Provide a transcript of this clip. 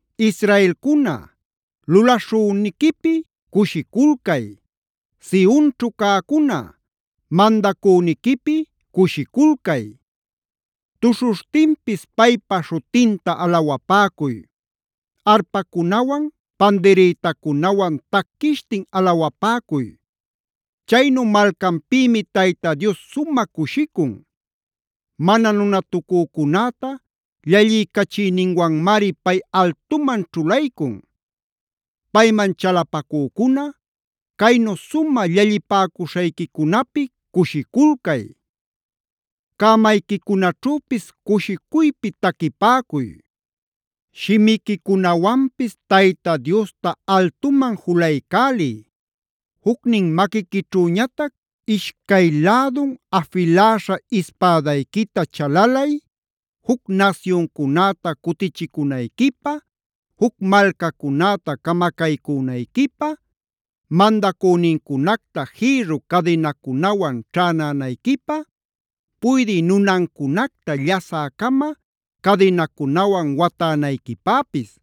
Israelcuna, lulaśhüniquipi cushiculcay. Sionćhu cäcuna, mandacüniquipi cushiculcay. Tuśhuśhtinpis paypa śhutinta alawapäcuy. Arpacunawan pandirïtacunawan taquishtin alawapäcuy. Chaynu malcanpïmi Tayta Dios sumä cushicun. Mana nunatucücunäta llalliycachiyninwanmari pay altuman ćhulaycun. Payman chalapacücuna, caynu sumä llallipäcuśhayquicunapi cushiculcay. Cämayquicunaćhüpis cushicuypi taquipäcuy. Shimiquicunawanpis Tayta Diosta altuman julaycäliy. Jucnin maquiquićhüñatac ishcay lädun afiläśha ispädayquita chalalay, juc nasyuncunäta cutichicünayquipä, juc malcacunäta camacaycünayquipä, mandacünincunacta jïrru cadinacunawan ćhänänayquipä, puydï nunancunacta llasä-cama cadinacunawan watänayquipäpis.